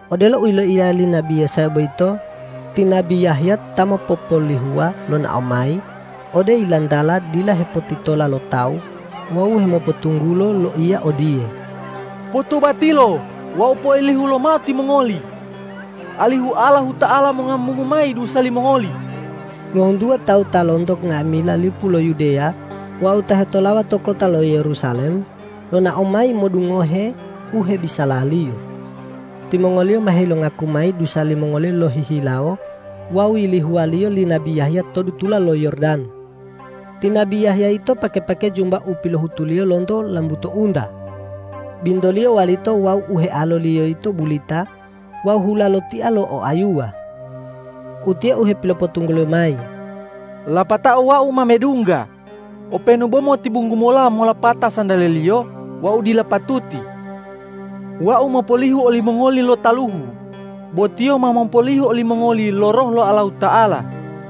Odelo u yiloiya li nabi Yesaya boyito, ti nabi Yahya ta mopopolihuwa lonao mayi ode yilantala dila hepotitola lo tawu wawu hemopotunggulo loiya odiye,”Potobatilo wawu poilihu lomao timongoli, alihu Allahuta'ala mongambungu mayi dusa limongoli.” Ngohuntuwa tawu ta lonto nga'amila lipu lo Yudeya wawu ta hetolawa to kota lo Yerusalem, lonao mayi modungohe u hebisalaliyo. Timongoliyo ma helongaku mayi dusa limongoliyo lohihilawo wawu yilihuwaliyo li nabi Yahya to dutula lo Yordan. Ti nabi Yahya yito pake-pake jumba u pilohutuliyo lonto lambuto unta, bintoliyo walito wawu u healoliyo yito bulita wawu hula lo tia lo oayuwa. Utiye u hepilopotungguliyo mayi,”Lapatao wau ma medungga openu bo motibunggu mola molopata santale-Liyo wau dila patuti. Wau mopolihu olimongoli lo taluhu, bo Tiyo ma mopolihu olimongoli lo Roh lo Allahuta'ala.”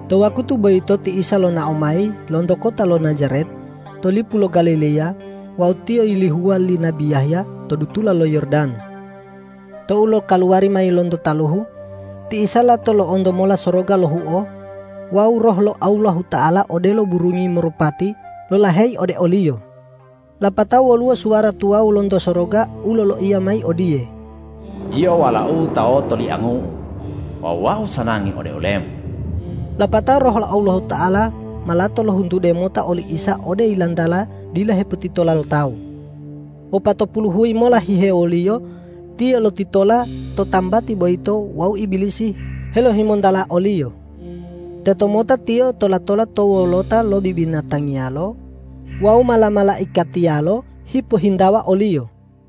To wakutu boyito ti Isa lonao mayi lonto kota lo Najaret to lipu lo Galileya wawu Tiyo yilihuwa li nabi Yahya to dutula lo Yordan. Tou lokaluwari mayi lonto taluhu, ti Isa lato lo'onto mola soroga lohuo wawu Roh lo Allahuta'ala odelo burungi marupati lolaheyi ode o-Liyo. Lapatao woluwo suwara tuwawu lonto soroga u loloiya mayi odiye,”Yio Walau-U ta otoliangu-U wawu Wau sanangi ode ole-Mu.” Lapatao Roh lo Allahuta'ala ma lato lohuntude mota oli Isa ode yilantala dila hepotitola lo tawu. Wopatopulu huyi mola hihewoliyo Tiyo lotitola to tambati boyito wawu Ibilisi helohimontala o-Liyo. Tetomota Tiyo tola-tola to wolota lo bibinatangiyalo wawu mala-malaikatiyalo hipohintawa o-Liyo.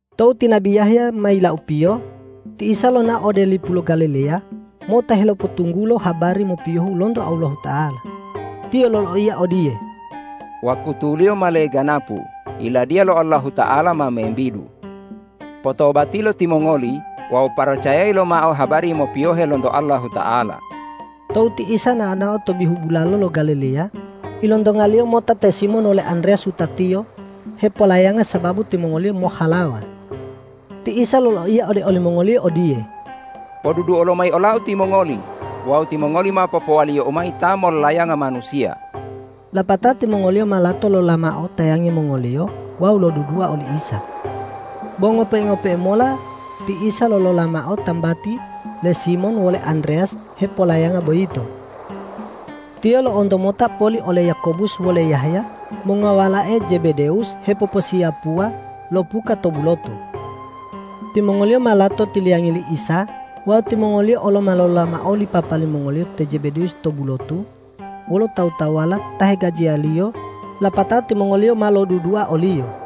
Tou ti nabi Yahya ma yilaupiyo, ti Isa lonao ode lipu lo Galileya mota helopotunggulo habari mopiyohu lonto Allahuta'ala. Tiyo loloiya odiye,”Wakutuliyo ma leganapu. Yiladiya lo Allahuta'ala ma membidu. Potobatilo timongoli wawu paracayayi lomao habari mopiyohe lonto Allahuta'ala!” Tou ti Isa nao-nao to bihu bulalo lo Galileya, ilontonga-Liyo mota te Simon wole Andreyas wutatiyo hepolayanga sababu timongoliyo mohhalawa. Ti Isa loloiya ode olimongoliyo odiye,”Poduduo lomayi ola-U timongoli wawu timongoli ma popowaliyo-U mayi ta mollayanga manusiya.” Lapatao timongoliyo ma lato lolola mao tayangi mongoliyo wawu lodudua oli Isa. Bo ngope-ngope'e mola ti Isa lolola mao tambati le Simon wole Andreyas hepolayanga boyito. Tiyo lo'onto mota poli ole Yakobus wole Yahya mongowalae Jebedewus hepoposiyapuwa lo puka to bulotu. Timongoliyo ma lato tiliyangayi li Isa wawu timongoliyo olo ma lolola mao oli papa limongoliyo te Jebedewus to bulotu wolo tawu-tawuwala ta hegajiyaliyo, lapatao timongoliyo ma lodudua o-Liyo.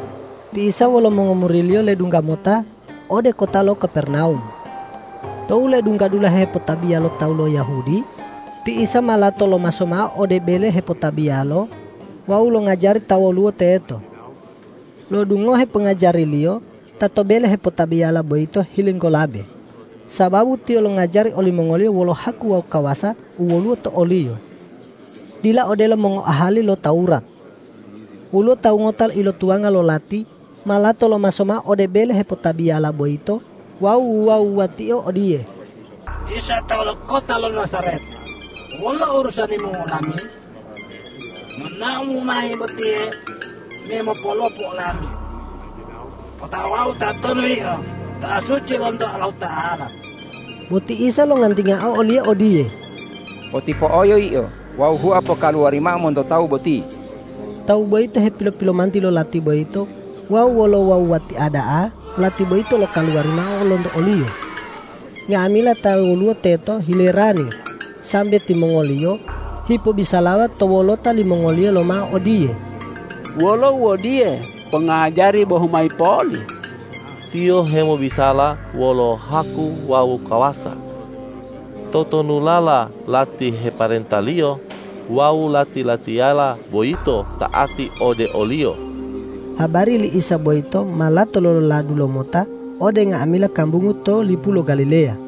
Ti Isa wolo mongomuri-Liyo ledungga mota ode kota lo Kapernawum. Tou ledungga dulahe hepotabiya lo tawu lo Yahudi, ti Isa ma lato lomaso mao ode bele hepotabiyalo wawu longajari ta woluwo teto. Lo'odungoheo pongajari-Liyo ta to bele hepotabiyala boyito hilinggolabe, sababu Tiyo longajari olimongoliyo wolo haku wawu kawasa u woluwo to o-Liyo, dila odelo mongoahali lo Tawurat. Woluwo tawu ngota ilotuwanga lo lati ma lato lomaso mao ode bele hepotabiyala boyito wawu wuwa-wuwatio odiye, ”Isa tawu lo kota lo Najaret, wolo urusani-Mu wolami? Nonao-Mu mayi botiye me mopolopu olami. Otawau tatonu Yio: Ta suci lonto Allahuta'ala!” Bo ti Isa longantingao oliyo odiye,”Potipo'oyo yio wawu hua pokaluwari mao monto tawu boti!” Tawu boyito hepilo-pilomanti lo lati boyito wawu wolo uwuwa-wuwatia da'a lati boyito lokaluwari mao lonto oliyo. Nga'amila ta woluwo teto hilerani sambe timongoliyo hipobisalawa to wolota limongoliyo lomao odiye,”Wolo u odiye, pongajari bohu mayi poli? Tiyo hemobisala wolo haku wawu kawasa. Totonulala lati heparenta-Liyo wawu lati-latiyala boyito ta'ati ode o-Liyo.” Habari li Isa boyito ma lato lololadu lomota ode nga'amila kambungu to lipu lo Galileya.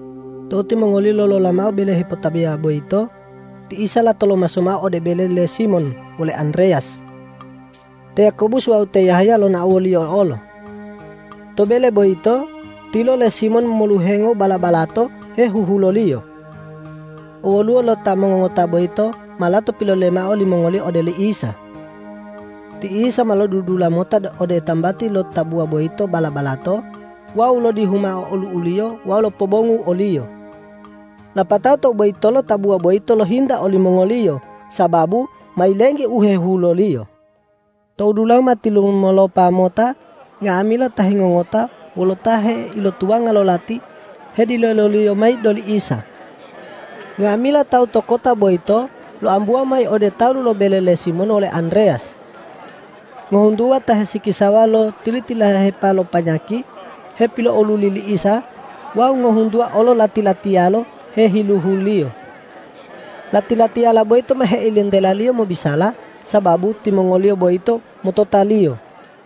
Tou timongoliyo lolola mao bele hepotabiyala boyito, ti Isa lato lomaso mao ode bele le Simon wole Andreyas. Te Yakobus wawu te Yahya lonao wo-Liyo olo. To bele boyito, tilo le Simon moluhengo bala-balato hehuhuloliyo. Owwoluwo lo ta mongongota boyito ma lato pilolele mao limongoliyo ode oli Isa. Ti Isa ma lodudula mota ode tambati lo tabuwa boyito bala-balato wawu lodihu mao olu'uliyo wawu lopobongu oliyo. Lapatao tou boyitolo tabuwa boyito lohinta olimongoliyo sababu ma yilenggi u hehuhuloliyo. Tou dulahu ma tilumolopa mota nga'amila ta hengongota wolo ta heilotuwanga lo lati hedileloliyo mayi ode oli Isa. Nga'amila tawu to kota boyito loambuwa mayi ode talu lo bele le Simon wole Andreyas. Ngohuntuwa ta hesikisawa lo tili-tililahepala lo panyaki hepilo'oluli li Isa wawu ngohuntuwa olo lati-latiyalo hehiluhu-Liyo. Lati-latiyala boyito ma heilentela-Liyo mobisala, sababu timongoliyo boyito motota-Liyo.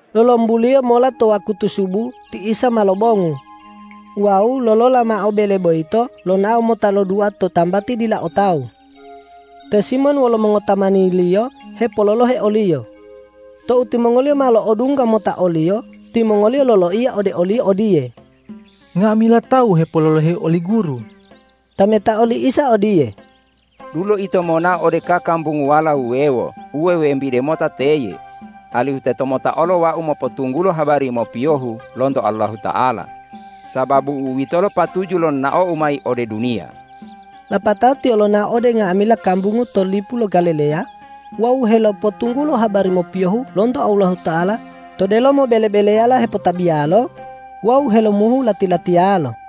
Lolombuliyo mola to wakutu subu ti Isa ma lobongu wawu lolola mao bele boyito lonao mota lodua to tambati dila o tawu. Te Simon wolo mongotamaniliyo hepololohe o-Liyo. Tou timongoliyo ma lo'odungga mota o-Liyo, timongoliyo loloiya ode o-Liyo odiye,”Nga'amila tawu hepololohe oli Guru.” Tametao li Isa odiye,”Dulo ito monao ode kakambunguwala wuwewo u wewembide mota teye, alihu teto mota olo Wau mopotunggulo habari mopiyohu lonto Allahuta'ala, sababu u'uwitolo patuju lo nonao-U mayi ode duniya.” Lapatao Tiyo lonao ode nga'amila kambungu to lipu lo Galileya wawu helopotunggulo habari mopiyohu lonto Allahuta'ala to delomo bele-beleyala hepotabiyalo wawu helomuhu lati-latiyalo.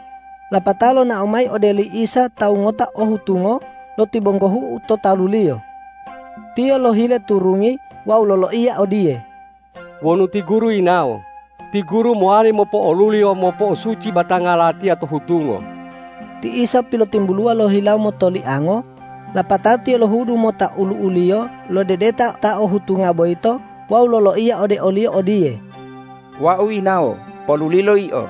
Lapatao lonao mayi ode oli Isa tawu ngota o hutungo lotibonggohu'u to talu-Liyo. Tiyo lohile turungi wawu loloiya odiye,”Wonu ti Guru yinawo, ti Guru mowali mopo'oluli wawu mopo'osuci batanga latiya to hutungo.” Ti Isa pilotimbuluwa lohilawo motoliango, lapatao Tiyo lohudu mota olu'u-Liyo lodedeta ta o hutunga boyito wawu loloiya ode oliyo odiye,”Wau yinawo. Polulilo yio!”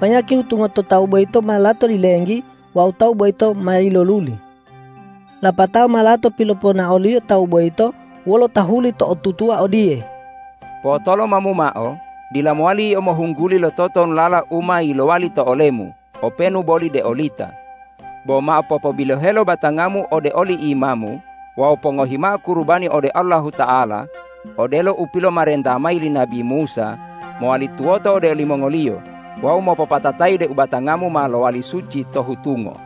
Panyaki hutunga to tawu boyito ma lato yilenggi wawu tawu boyito ma yiloluli. Lapatao ma lato piloponao-Liyo tawu boyito wolo tahuli to'otutuwa odiye, ”Po'otolomamu mao, dila mowali yio mohungguli lo totonulala u ma yilowali to olemu openu boli deolita, bo mao popobilohelo batangamu ode oli imamu wawu pongohi mao kurubani ode Allahuta'ala odelo u pilomarenta mayi li nabi Musa mowali tuwoto ode olimongoliyo wawu mopopatatayi deu batangamu ma lowali suci to hutungo.”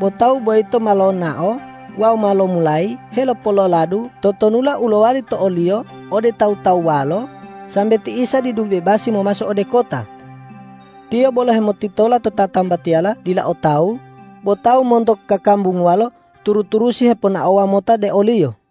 Bo tawu boyito ma lonao wawu ma lomulayi helopololadu totonulala u lowali to oliyo ode tawu-tawuwalo, sambe ti Isa didu bebasi momaso ode kota. Tiyo bolo hemotitola to tatambatiyala dila o tawu, bo tawu monto kakambunguwalo turu-turusi heponaowa mota de o-Liyo.